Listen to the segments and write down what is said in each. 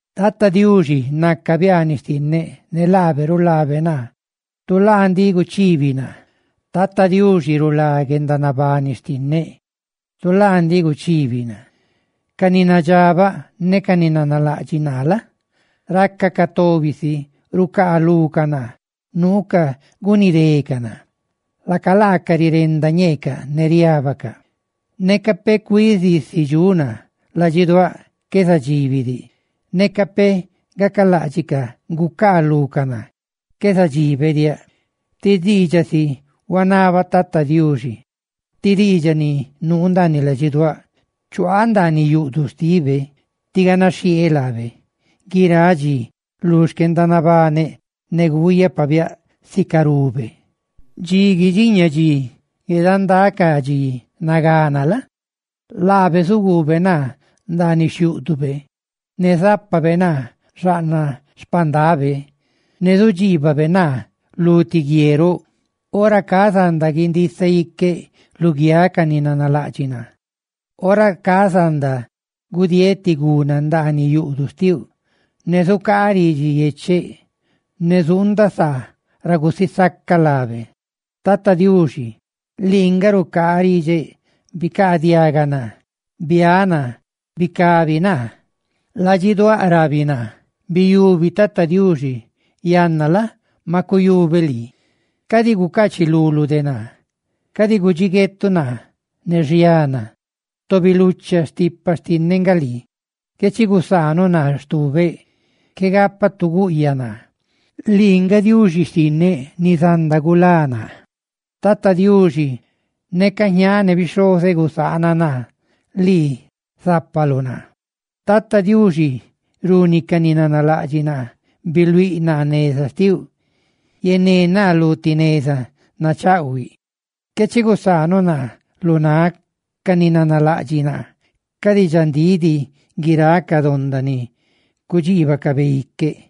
Tata Diuxi naca biaaniꞌ xtinneꞌ ne laabe rulabe naa, tu laa ndiꞌ guchibi naa. Tata Diuxi rulá guendanabani xtinneꞌ, tu laa ndiꞌ guchibi naa. Ca ni nadxabaꞌ ne ca ni nanalaꞌdxiꞌ naa la? racacaꞌ tobi si rucaalucaꞌ naa, nuucaꞌ gunidecaꞌ naa; laca laacaꞌ rirenda ñeecaꞌ ne riábacaꞌ. Neca peꞌ cuizisi dxuꞌ naa, ladxiduáꞌ qué zadxibi diꞌ; neca peꞌ gacaláꞌdxicaꞌ gucaalú ca naa, qué zadxibe diaꞌ. Ti diidxaꞌ si huanaba Tata Diuxi, ti diidxaꞌ ni nuu ndaaniꞌ ladxiduáꞌ: chuaaꞌ ndaaniꞌ yuꞌduꞌ xtibe tí ganaxhieeꞌ laabe guiráꞌ dxi lu xquendanabaneꞌ, ne guuyaꞌ pabiáꞌ sicarube. Dxi guidxiña dxi, guedandá ca dxi nagana la? laabe zuguube naa ndaaniꞌ xhiúꞌdube; ne zápabe naa xaꞌnaꞌ xpandabe. ¡Ne zudxiibabe naa lu ti guie roꞌ! Ora ca zanda guindisaꞌ iqueꞌ luguiáꞌ ca ni nanalaꞌdxiꞌ naa; ora ca zanda gudieeꞌ ti gunaa ndaandiꞌ yuꞌduꞌ xtiuꞌ, ne zucaaꞌ ridxi yecheꞌ, ne zuundaꞌ saa ra gusisacaꞌ laabe. Tata Diuxi, lii nga rucaariꞌdxeꞌ, bicaadiaga naa. Biáꞌ naa, ¡bicabi naa! Ladxiduáꞌ rabi naa: «Biyubi Tata Diuxi.» Yanna la? maꞌ cuyubeꞌ lii. ¡Cadi gucachiluluꞌ de naa! ¡Cadi gudxiguetuꞌ naa ne xiana! ¡Tobi lucha stipa xtinneꞌ nga lii! Qué chi gusaanuꞌ naa stubeꞌ, qué gapaꞌ tu guꞌyaꞌ naa, lii nga Diuxi xtinneꞌ ni zanda gulá naa. Tata Diuxi, neca jñaaꞌ ne bixhozeꞌ gusaana naa, lii zapaluꞌ naa. Tata Diuxi, runi ca ni nanalaꞌdxiꞌ naa; biluíꞌ naa neza xtiluꞌ, yené naa lu ti neza nachaꞌhuiꞌ; qué chi gusaanuꞌ naa lu náꞌ ca ni nanalaꞌdxiꞌ naa, cadi dxandíꞌ diꞌ, guiráꞌ ca donda ni cudxiibacabe iqueꞌ.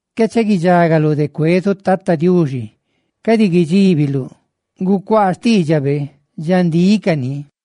¡Qué chi guidxagaluꞌ de cuezuꞌ Tata Diuxi! ¡Cadi guidxíbiluꞌ! ¡Gucuaa xtiidxabe, dxandíꞌ cani!